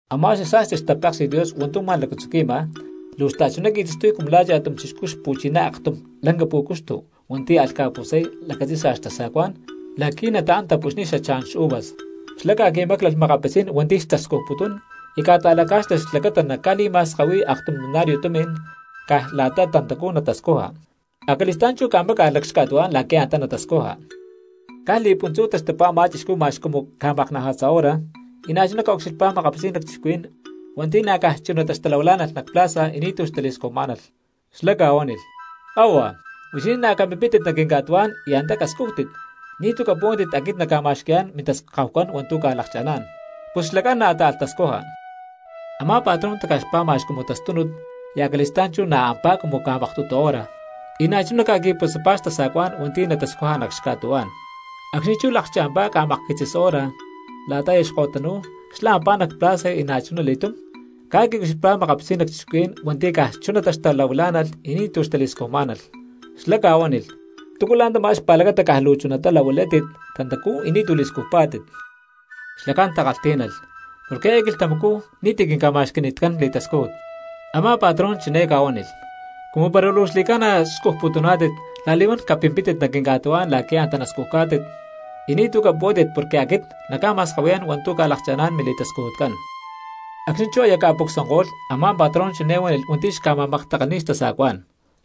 ’Amá xasa̠sti xtapéksi̠t Dios hua̠ntu̠ ma̠lacatzuqui̠ma, luu xta̠chuná qui̠taxtuy cumu la̠ cha̠tum chixcú xpu̠chiná aktum lanca pú̠cuxtu hua̠nti̠ alh ca̠putzay lacatzi̠sa xtasa̠cuá̠n la̠qui̠ nataán tapuxniy xachá̠n xuvas. Xlá ca̠qui̠máclalh makapitzí̠n hua̠nti̠ xtascujputún y ca̠ta̠lacá̠xlalh xlacata naca̠li̠ma̠skahui̠y aktum denario tumi̠n caj la̠ta tantacú natascuja, acali̠stá̠n chú ca̠máca̠lh nac xca̠tuhuá̠n la̠qui̠ antá natascuja. Caj li̠puntzú taxtupá a̠má chixcú ma̠x cumu ca̠maknaja̠tza hora, y na̠chuná ca̠ucxilhpá makapitzí̠n lacchixcuhuí̠n hua̠nti̠ na̠ caj chunatá xtalahuilá̠nalh nac plaza y ni̠tu̠ xtali̠scujmá̠nalh. Xlá ca̠huánilh: “¡Kahua, huixinín na̠ capimpítit nac quinca̠tuhuá̠n y antá cascújtit, ni̠tu̠ capuhuántit aquit nacca̠ma̠xqui̠yá̠n mintaskahucán hua̠ntu̠ lakchá̠n!” Pus xlacán na̠ táalh tascuja. Amá patrón taca̠xpá ma̠x cumu tastúnut y acali̠stá̠n chú na̠ ampá cumu ca̠maktutu hora, y na̠chuná ca̠qui̠putzapá xtasa̠cuá̠n hua̠nti̠ natascuja nac xca̠tuhuá̠n. Acxni̠ chú lakcha̠mpá ca̠makquitzis hora la̠ta aya ko̠tanu̠ko̠y xla̠ ampá nac plaza y na̠chuna li̠túm ca̠ucxilhpá makapitzí̠n lacchixcuhuí̠n hua̠nti̠ caj chunatá xtahuilá̠nalh y ni̠tu̠ xtali̠scujmá̠nalh. Xlá ca̠huánilh: “¿Túcu la̠ntamá xpa̠lacata caj luu chunatá lahuilátit tantacú y ni̠tu̠ li̠scujpá̠tit?” Xlacán takalhtí̠nalh: “Porque eé quilhtamacú ni̠ti̠ quinca̠ma̠xqui̠ni̠tán li̠tascújut.” Amá patrón chiné ca̠huánilh: “Cumu para luu xli̠ca̠na scujputuná̠tit la̠li̠huán capimpítit nac quinca̠tuhuá̠n la̠qui̠ antá nascujá̠tit, y ni̠tu̠ capuhuántit porque aquit nacca̠ma̠skahui̠yá̠n hua̠ntu̠ ca̠lakcha̠ná̠n mili̠tascujutcán.” ’Acxni̠ chú aya ca̠pucsuanko̠lh, a̠má patrón chiné huánilh hua̠nti̠ xca̠ma̠maktakalhni̠y xtasa̠cuá̠n: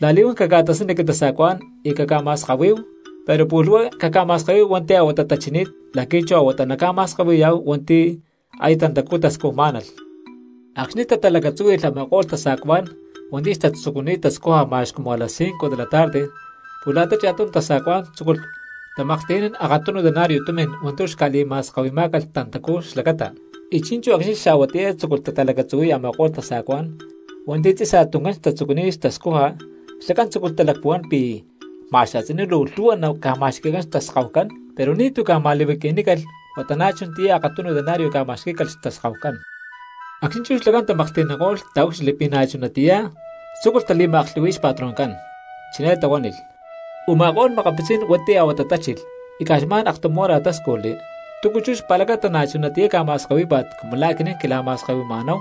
“La̠li̠huán caca̠tasani quintasa̠cuá̠n y caca̠ma̠skahui, pero pu̠lh huá caca̠ma̠skahui hua̠nti̠ a̠huatá tachini̠t la̠qui̠ chú a̠huatá naca̠ma̠skahui̠ya hua̠nti̠ aya tantacuá tascujmá̠nalh.” Acxni̠ tatalacatzúhui̠lh a̠máko̠lh tasa̠cuá̠n hua̠nti̠ xtatzucuni̠t tascuja ma̠x cumu a las cinco de la tarde pus la̠ta cha̠tunu tasa̠cuá̠n tzúculh tamaklhti̠nán akatunu denario tumi̠n hua̠ntu̠ xca̠li̠ma̠skahui̠má̠calh tantacú xlacata. Y chi̠nchú acxni̠ xaa̠huatiyá tzúculh tatalacatzuhui̠y a̠ma̠ko̠lh tasa̠cuá̠n hua̠nti̠ tzi̠saj tuncán xtatzucuni̠t tascuja xlacán tzúculh talacpuhuán pi̠ ma̠x a̠tzinú luu lhu̠hua naca̠ma̠xqui̠cán xtaskahucán, pero ni̠tu̠ ca̠ma̠li̠huaqui̠nícalh huata na̠ chunatiyá akatunu denario ca̠ma̠xquí̠calh xtaskahucán. Acxni̠ chú xlacán tamaklhti̠nanko̠lh taúcxilhli pi̠ na̠ chunatiyá, tzúculh tali̠ma̠aklhu̠hui̠y xpatroncán. Chiné tahuánilh: “Uma̠ko̠lh makapitzí̠n hua̠nti̠ a̠huatá tachilh y caj xma̠n aktum hora táscujli, ¿túcu chú xpa̠lacata na̠ chunatiyá ca̠ma̠skahuí̠pa̠t cumu lá̠ aquinín quila̠ma̠skahui̠ma̠náhu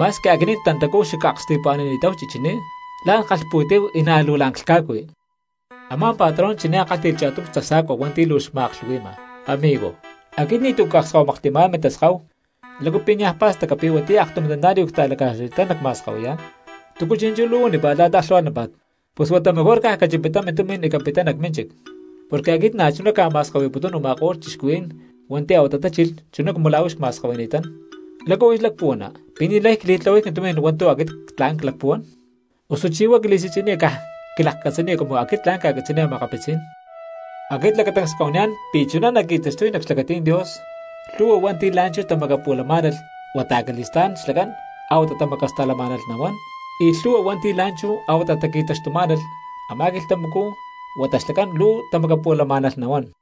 ma̠squi aquinín tantacú xacaksti̠pu̠ani̠ni̠táhu chichiní, la̠n ckalhpu̠tí̠hu y na̠ luu la̠n clhca̠cui?” Amá patrón chiné kálhti̠lh cha̠tum tasa̠cua hua̠nti̠ luu xma̠aklhu̠hui̠ma: “Amigo, aquit ni̠tu̠ cakskahuimaklhti̠má̠n mintaskahu. ¿Lácu pi̠ niaj pa̠staca pi̠ huatiyá aktum denario cta̠laca̠xlani̠tán nacma̠skahui̠yá̠n? ¿Túcu chi̠nchú luu huanípa̠t la̠ta aklhu̠hua̠tnámpa̠t? Pus huata mejor caj cachipatá mintumi̠n y capittá nac mínchic. Porque aquit na̠chuná cca̠ma̠skahui̠putún u̠ma̠ko̠lh cristianos hua̠nti̠ a̠huatá tachilh chuná cumu la̠ huix cma̠skahui̠ni̠tán. ¿Lácu huix lacpuhuana pi̠ ni̠lay cli̠tlahuay quintumi̠n hua̠ntu̠ aquit tla̠n clacpuhuán? ¿Osuchí huá quili̠si̠tzi̠niya caj quilakcatzaniya cumu aquit tla̠n cca̠catzi̠niy cristianos?” ’Aquit lacatancs cca̠huaniyá̠n pi̠ chuná naqui̠taxtuy nac xlacatí̠n Dios, lhu̠hua hua̠nti̠ la̠nchú tamacapu̠lamá̠nalh huata acali̠stá̠n xlacán a̠huatá tamacasta̠lamá̠nalh nahuán, y lhu̠hua hua̠nti̠ la̠nchú a̠huatá taqui̠taxtumá̠nalh, a̠má quilhtamacú huata xlacán luu tamacapu̠lamá̠nalh nahuán.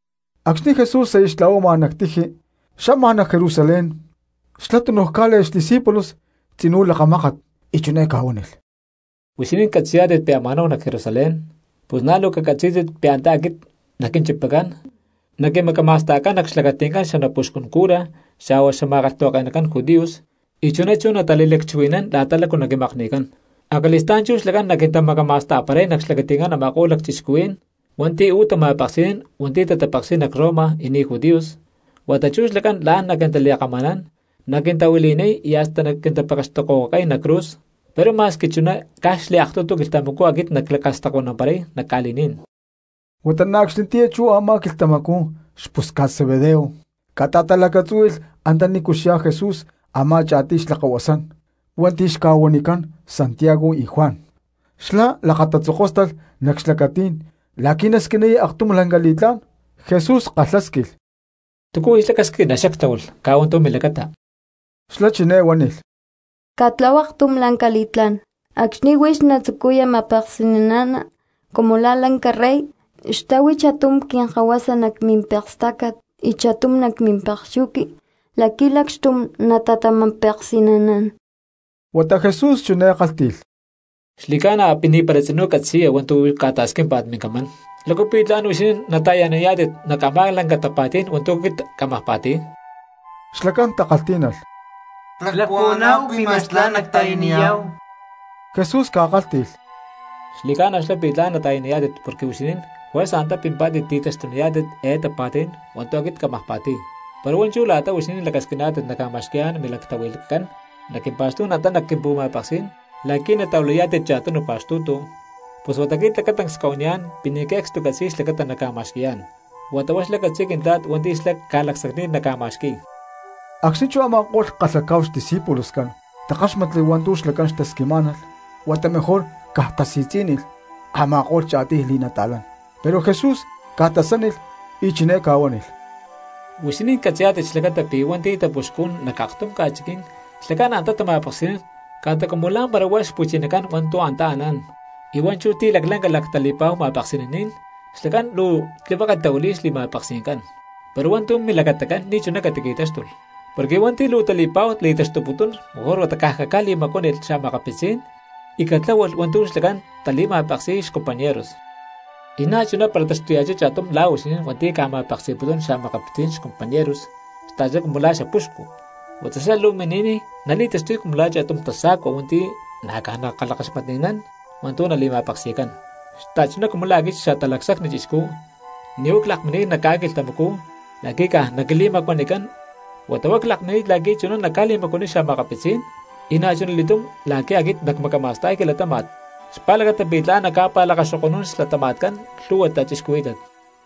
Acxni̠ Jesús aya xtla̠huama nac tiji xama nac Jerusalén xlá tunuj cá̠le̠lh xdiscípulos tzinú lakamákat y chiné ca̠huánilh: —Huixinín catzi̠yá̠tit pi̠ ama̠náhu nac Jerusalén; pus na̠ luu cacatzí̠tit pi̠ antá aquit naquinchipacán naquimacama̠sta̠cán nac xlacati̠ncán xanapuxcun cura xa̠huá xma̠kalhtahuake̠nacán judíos y chuná chú natali̠lacchuhui̠nán la̠ta lácu naquimakni̠cán. Acali̠stá̠n chú xlacán naquintamacama̠sta̠paray nac xlacati̠ncán a̠ma̠ko̠lh lacchixcuhuí̠n hua̠nti̠ uú tama̠peksi̠nán hua̠nti̠ tatapeksi̠y nac Roma y ni̠ judíos, huata chú xlacán la̠n naquintali̠kama̠nán, naquintahuili̠niy y hasta naquintapekextokohuacay nac cruz; pero ma̠squi chuná caj xliaktutu quilhtamacú aquit naclacastacuanamparay nac ca̠li̠ní̠n. Huata na̠ acxnitiyá chú a̠má quilhtamacú xpusca̠t Zebedeo ca̠ta̠talacatzúhui̠lh antanícu xyá Jesús a̠má cha̠tiy xlakahuasán hua̠nti̠ xca̠huanicán Santiago y Juan. Xlá lakatatzokóstalh nac xlacatí̠n la̠qui̠ nasquiniy aktum lanca li̠tlá̠n. Jesús kalhásquilh: —¿Túcu huix lacasquina xactláhualh caj hua̠ntu̠ milacata? Xlá chiné huánilh: —Catlahua aktum lanca li̠tlá̠n, acxni̠ huix natzucuya ma̠peksi̠nana cumu la̠ lanca rey, xtáhui cha̠tum quinkahuasa nac mimpekstácat y cha̠tum nac mimpekxuqui la̠qui̠ lacxtum natata̠ma̠peksi̠naná̠n. Huata Jesús chiné kálhti̠lh: —Xli̠ca̠na pi̠ ni̠para tzinú catzi̠ya hua̠ntu̠ ca̠ta̠squímpa̠t mincamán. ¿Lácu pi̠ tla̠n huixinín nata̠yaniyá̠tit nac a̠má lanca tapa̠tí̠n hua̠ntu̠ aquit cámaj pa̠ti̠y? Xlacán takalhtí̠nalh: —Clacpuhuaná̠hu pi̠ ma̠x tla̠n nacta̠yaniyá̠hu. Jesús ca̠kálhti̠lh: —Xli̠ca̠na xlá pi̠ tla̠n nata̠yaniyá̠tit porque huixinín juerza antá pimpá̠tit ti̠taxtuniyá̠tit eé tapa̠tí̠n hua̠ntu̠ aquit cámaj pa̠ti̠y; pero hua̠nchú la̠ta huixinín lacasquiná̠tit nacca̠ma̠xqui̠yá̠n milactahui̠lhcán nac quimpa̠xtú̠n antá nac quimpu̠ma̠peksí̠n la̠qui̠ natahuilayá̠tit cha̠tunu pa̠xtu̠tu, pus aquit lacatancs cca̠huaniyá̠n pi̠ ni̠ que̠cstu ccatzi̠y xlacata nacca̠ma̠xqui̠yá̠n, huata huá xlá catzi̠y Quintla̠t hua̠nti̠ xlá ca̠lacsacni̠t naca̠ma̠xqui̠y. Acxni̠ chú a̠ma̠ko̠lh xa̠kalhacá̠hu xta̠discípuloscán takáxmatli hua̠ntu̠ xlacá̠n xtasquimá̠nalh huata mejor caj tasi̠tzí̠nilh a̠ma̠ko̠lh cha̠tiy li̠nata̠lán. Pero Jesús ca̠tasánilh y chiné ca̠huánilh: —Huixinín catzi̠yá̠tit xlacata pi̠ hua̠nti̠ tapuxcún nac aktum ca̠chiquí̠n xlacán antá tama̠peksi̠nán ca̠ta cumu la̠mpara huá xpu̠chinacán hua̠ntu̠ antá anán, y hua̠nchú ti̠ laclanca lactali̠pa̠hu ma̠peksi̠naní̠n xlacán luu tlihueke tahuili̠y xli̠ma̠peksi̠ncán. Pero hua̠ntu̠ milacatacán ni̠chuná catiqui̠táxtulh. Porque hua̠nti̠ luu tali̠pa̠hu li̠taxtuputún mejor huata caj caca̠li̠macuánilh xa̠makapitzí̠n y catláhualh hua̠ntu̠ xlacán natali̠ma̠peksi̠y xcompañeros. Y na̠chuná para taxtuya̠chá cha̠tum la̠ huixinín hua̠nti̠ ca̠ma̠peksi̠putún xa̠makapitzí̠n xcompañeros xta̠chuná cumu lá xapuxcu, huata xlá luu mini̠niy nali̠taxtuy cumu la̠ cha̠tum tasa̠cua hua̠nti̠ na̠ caj nakalhakaxmatni̠nán hua̠ntu̠ nali̠ma̠peksi̠cán. Xta̠chuná cumu la̠ aquit Xatalacsacni Chixcú ni̠ huá clakmini̠t nac ca̠quilhtamacú la̠qui̠ caj naquili̠macuanicán, huata huá clakmini̠t la̠qui̠ chuná nacca̠li̠macuaniy xa̠makapitzí̠n, y na̠chuna li̠túm la̠qui̠ aquit nacmacama̠sta̠y quilatáma̠t xpa̠lacata pi̠ tla̠n nacca̠pa̠lakaxoko̠nún xlatama̠tcán lhu̠hua cristianos.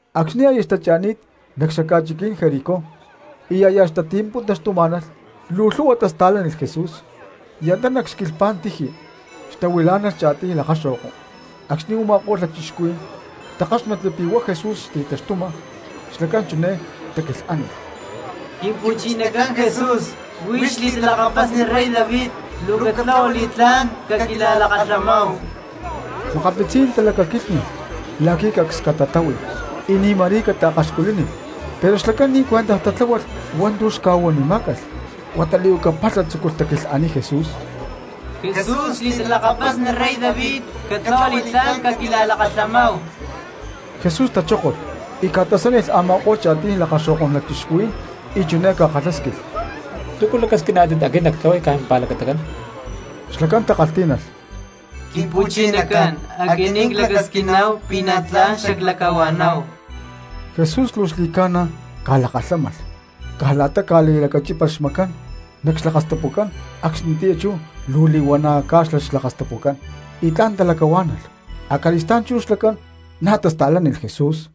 Acxni̠ aya xtacha̠ni̠t nac xaca̠chiquí̠n Jericó y aya xtati̠puntaxtumá̠nalh luu lhu̠hua cristianos tasta̠lánilh Jesús. Y antá luu nac xquilhpá̠n tiji xtahuilá̠nalh cha̠tiy lakaxo̠ko. Acxni̠ u̠ma̠ko̠lh lacchixcuhuí̠n takáxmatli pi̠ hua̠ Jesús xti̠taxtuma xlacán chiné taquilhánilh: —¡Quimpu̠chinacán Jesús, huix xli̠talakapasni rey David, luu catlahua li̠tlá̠n caquila̠lakalhamáhu! Makapitzí̠n cristianos talacaquílhni̠lh la̠qui̠ cacs catatáhui y ni̠ ma̠rí cataakaxculínilh, pero xlacán ni̠ cuentaj tatláhualh hua̠ntu̠ xca̠huanimá̠calh huata li̠huaca palha tzúculh taquilhaniy Jesús: —¡Jesús xli̠talakapasni rey David, catlahua li̠tlá̠n caquila̠lakalhamáhu! Jesús tachókolh y ca̠tasánilh a̠ma̠ko̠lh cha̠tiy lakaxo̠kó̠n lacchixcuhuí̠n y chiné ca̠kalhásquilh: —¿Túcu lacasquiná̠tit aquit nactlahuay caj mimpa̠lacatacán? Xlacán takalhtí̠nalh: —Quimpu̠chinacán, aquinín clacasquiná̠hu pi̠ na̠ tla̠n xaclacahua̠nanáhu. Jesús luu xli̠ca̠na ca̠lakalhámalh y caj la̠ta ca̠li̠lacachípalh xmacán nac xlakastapucán acxnitiyá chú luu li̠huana̠ cá̠xlalh xlakastapucán y tla̠n talacahuá̠nalh. Acali̠stá̠n chú xlacán na̠ tasta̠lánilh Jesús.